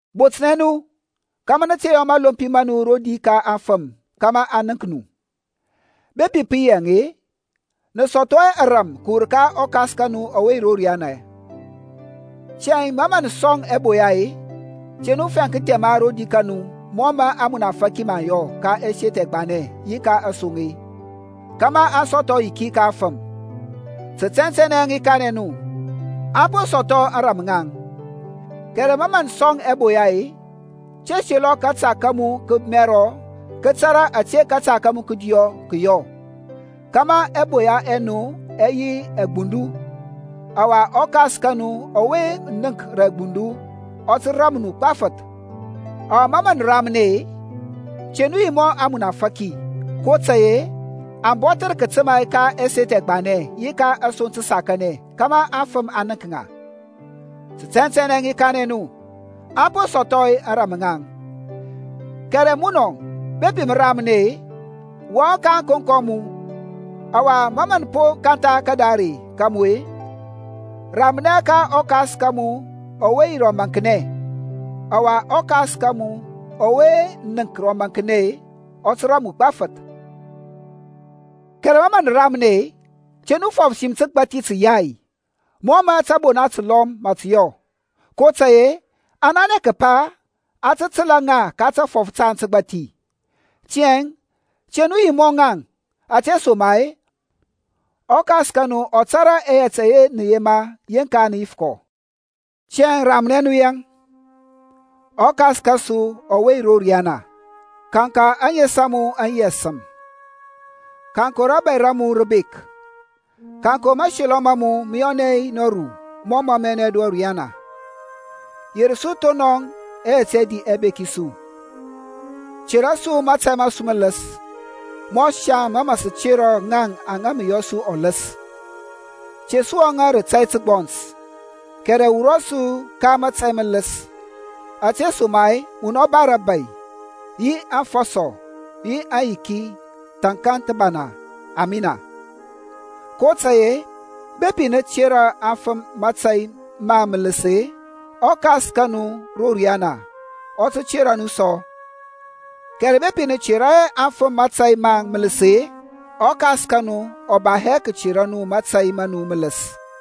Botnɛ nu kȧmȧ nǝ te yɔ mȧlompi ma nu rodi ka aŋfǝm kȧmȧ aŋ nənk nu. Bepi pǝ yi yaŋ-e, nǝ sɔthɔ hɛ ȧrȧm kǝwur ka ɔKas ka nu ɔwe yi ro riyana. Tiyȧŋ ma mǝ nǝ sɔŋ ɛboya-e, te nu fɛŋ kǝthɛma rodi ka nu mɔ mǝ ȧŋmunafȧki mǝ aŋ yɔ ka ɛseth ɛgbanɛ yi ka asoŋ-e, kȧmȧ aŋ sɔthɔ ayiki ka aŋfǝm. Tǝ tɛntɛnɛ i kanɛ nu, aŋ po sɔthɔ ȧŋrȧm ŋaŋ. Kɛrɛ ma mǝ mǝ sɔŋ ɛboya-e, te selɔ kȧta ka mu kǝmɛrɔ kǝ tȧrȧ ȧte kȧta ka mu kǝdiyɔ kǝ yɔ; kȧmȧ ɛboya ɛ nu ɛ yi rǝ agbundu, ɔwa ɔKas ka nu ɔwe nənk rǝ agbundu ɔ tǝ ram nu gbafǝth. Ɔwa ma nǝ ramnɛ-e, te nu yi mɔ ȧŋmunafȧki, kotȧy-e aŋ bɔther kǝtǝma ka ɛseth ɛgbanɛ yi ka asoŋ tǝsakanɛ kȧmȧ aŋfǝm aŋ nənk ŋa. Tɛntɛnɛ i kanɛ nu, aŋ po sɔthɔ ȧŋrȧm ŋaŋ. Kɛrɛ munɔŋ, bepi mǝ ramnɛ-e, wɔŋ ka ȧŋkonko a mu, ɔwa ma mǝ po kantha kadare ka mu-e, ramnɛ ka ɔKas ka mu ɔwe yi rǝ ɔmaŋknɛ, ɔwa ɔKas ka mu ɔwe nənk rǝ ɔmaŋknɛ ɔ tǝ ram mu gbafǝth. Kɛrɛ ma nǝ ramnɛ-e, te nu fɔf sim tǝgbathi tǝyai, mɔ mǝ tȧbona tǝlɔm mǝ tǝ yɔ; kotȧy-e aŋ nanɛ kǝpa a tǝ tǝla ŋa ta tafɔf taŋ tǝgbathi. Tiyȧŋ te nu yi mɔ ŋaŋ, ȧtesoma-e ɔKas ka nu ɔ tȧrȧ ɛyɛt ɛyɛ nǝ yema yeŋka nǝ yif kɔ. Tiyȧŋ ramnɛ nu yaŋ; ƆKas kȧsu ɔwe yi ro riyana, kanka ȧŋes a mu aŋ yi ȧsǝm. Kaŋkɔ rȧbȧy ra mu rǝ bek. Kaŋkɔ mȧselɔ ma mu mǝ yɔnɛ nɔru mɔ mǝ mǝ yɔnɛ ro riyana. Yer su thonɔŋ ɛyɛt ɛdi ɛbeki su. Tera su mȧtȧy ma su mǝlǝs, mɔ saŋ mǝ sǝ tera ŋaŋ aŋa yɔ su ɔlǝs. Te su wɔŋȧ rǝ tȧy tǝgbɔns kɛrɛ wurɔ su ka mətȧy mǝlǝs; ȧtesoma-e munɔ ba rȧbȧy yi aŋfɔsɔ yi aŋyiki thȧnkȧŋ thǝbana, Amina. kotȧy-e, bepi nǝ tera afǝm mȧtȧy maŋ mǝlǝs-e, ɔKas ka nu ro riyana ɔ tǝ tera nu sɔ, kɛrɛ bepi nǝ tera hɛ afǝm mȧtȧy maŋ mǝlǝs-e, ɔKas ka nu ɔ ba hɛ kǝtera nu mȧtȧy ma nu mǝlǝs.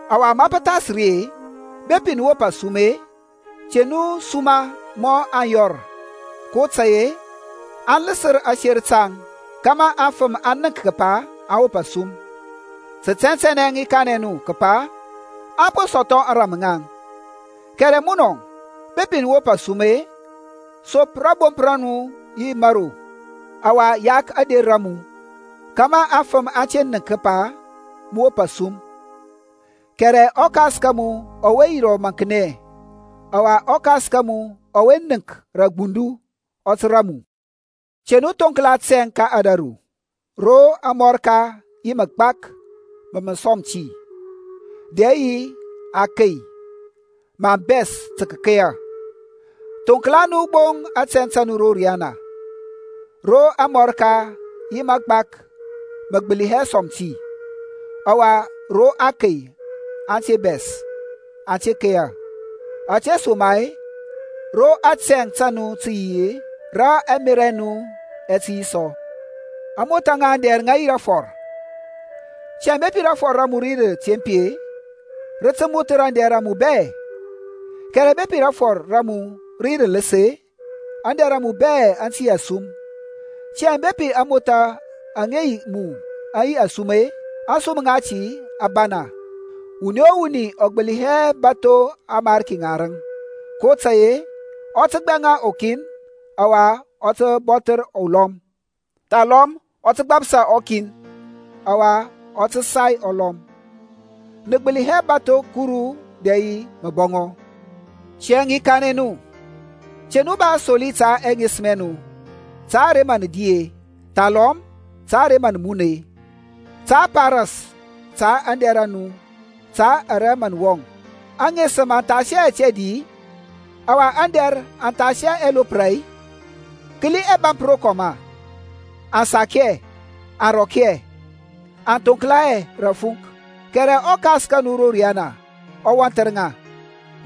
Ɔwa ma pǝ thas ri-e, bepi nǝ wop asum-e, te nu suma mɔ aŋyɔr; kotȧy-e aŋ lǝsǝr aser taŋ kȧmȧ aŋfǝm aŋ nənk kǝpa aŋ wop asum. Tǝ tɛntɛnɛ i kanɛ nu kǝpa aŋ po sɔthɔ ȧŋrȧm ŋaŋ. Kɛrɛ munɔŋ, bepi mǝ wop asum, sop rȧbomp ra mu yi mȧro, ɔwa yak ȧder a mu, kȧmȧ afǝm aŋ te nənk kǝpa mǝ wop asum-e, kɛrɛ ɔKas ka mu ɔwe yi rǝ ɔmaŋknɛ. Ɔwa ɔKas ka mu ɔwe nənk rǝ agbundu ɔ tǝ ram mu. Te nu thoŋklanɛ tɛŋ ka ȧdȧru ro amɔrka yi magbak mȧ mǝ sɔm ti, dɛ yi akey mǝ aŋ bɛs tǝ kǝkeya. Thoŋklanɛ nu gbo tɛŋ ro riyana, ro amɔrka yi mǝgbak mǝ gbǝli hɛ sɔm ti, ɔwa ro akey aŋ te bɛs, aŋ keya. Ȧtesoma-e ro atɛŋ ta nu tǝ yi-e, rǝ ɛmerȧ ɛ nu ɛ tǝ yi sɔ. ȧŋmothȧ ŋa aŋdɛr aŋ yi rafɔr. Tiyȧŋ bepi rafɔr ra mu rǝ yi rǝtempi-e, rǝ tǝ mothǝr aŋdɛr a mu bɛ. Kɛrɛ bepi rafɔr ra mu rǝ yi rǝlǝs-e, aŋdɛr a mu bɛ aŋ tǝ la asum. Tiyȧŋ bepi ȧŋmothȧ aŋa yi mu aŋ yi asum-e, ȧŋsum ŋati a bana! Wuni o wuni ɔ gbǝli hɛ bȧtho amarki ŋarǝŋ, kotȧy-e ɔ tǝ gbɛŋa ɔkin ɔwa ɔ tǝ bɔthǝr ɔlɔm; thalɔm ɔ tǝ gbapsa ɔkin, ɔwa ɔ tǝ sai ɔlɔm. Nǝ gbǝli hɛ bȧtho Kuru dɛ yi mǝbɔŋɔ. Tiyȧŋ i kanɛ nu, te nu ba asoli ta ɛŋesǝm ɛ nu, ta ara mǝ nǝ di-e, thalɔm ta ara mǝ nǝ mun-e, ta a pa ras ta aŋdɛr a nu ta ara mǝ nǝ wɔŋ. Aŋesǝm aŋ thas hɛ yɛt ɛdi-i, ɔwa aŋdɛr aŋ thas hɛ ɛloprȧ-i? Kǝli ɛbȧmp rokɔm-a, aŋ sak hɛ, aŋ rɔk hɛ, aŋ thonkla hɛ rǝ tǝfunk: kɛrɛ ɔKas ka nu ro riyana ɔ wɔnthǝr ŋa.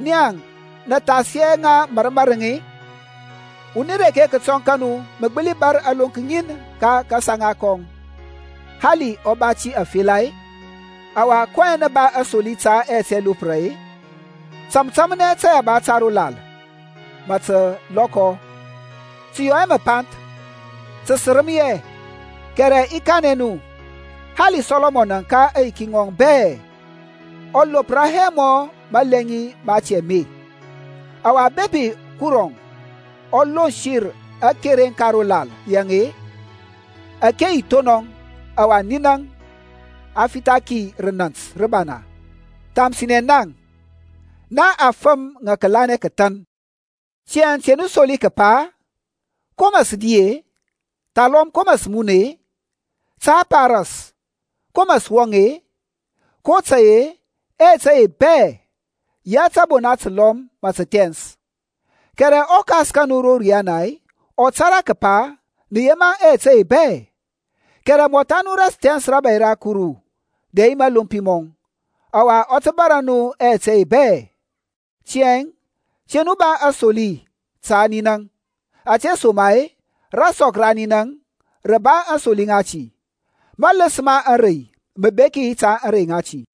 Naŋ-e, nǝ thas hɛ ŋa mȧrǝŋ mȧrǝŋ-i? Wuni reke kǝtɔŋ kȧnu mǝ gbǝli bȧr alonk ŋin ka kasaŋa kɔŋ, hali ɔ ba ti afela-e? Ɔwa kɔyɛŋ nǝ ba asoli ta yɛt ɛloprȧ-e? Tȧmtȧmnɛ tȧyaba ta ro lal ma mǝ tǝ lɔkɔ; tǝ yɔ hɛ mǝpanth, tǝ sǝrǝm hɛ, kɛrɛ i kanɛ nu-e, hali Sɔlɔmɔn ka aŋyiki ŋɔŋ bɛ ɔ lopra hɛ mɔ malɛŋi mati ame. Ɔwa bepi Kuruȧŋ ɔ lonsǝr akereŋ ka ro lal yaŋ-e, ȧke yi thonɔŋ, ɔwa ninaŋ a fitha ki rǝ nȧnt nǝbana; thamsinɛ naŋ-e, nia afǝm ŋa kǝlanɛ kǝthan. Tiyȧŋ te nu soli kǝpa, Ko mǝ sǝ di-e, thalɔm ko mǝ sǝ mun-e, ta a pa ras ko mǝ sǝ wɔŋ-e? kotȧy-e ɛyɛt ɛye bɛ-e, yɛ tȧbona tǝlɔm mǝ tǝ thɛns, kɛrɛ ɔKas ka nu ro riyana ɔ tȧrȧ kǝpa nǝ yema ɛyɛt ɛye bɛ. Kɛrɛ mɔtha nu thɛns rȧbȧy ra Kuru, dɛ yi mȧlompi mɔŋ, ɔwa ɔ tǝ bȧrȧ nu ɛyɛt ɛye bɛ. Tiyȧŋ te nu ba asoli ta ninaŋ, ȧtesoma-e rasɔk ra ninaŋ rǝ tǝ ba aŋsoli ŋati. Mȧlǝs ma ȧŋrey mǝ beki ta ȧŋrey ŋati.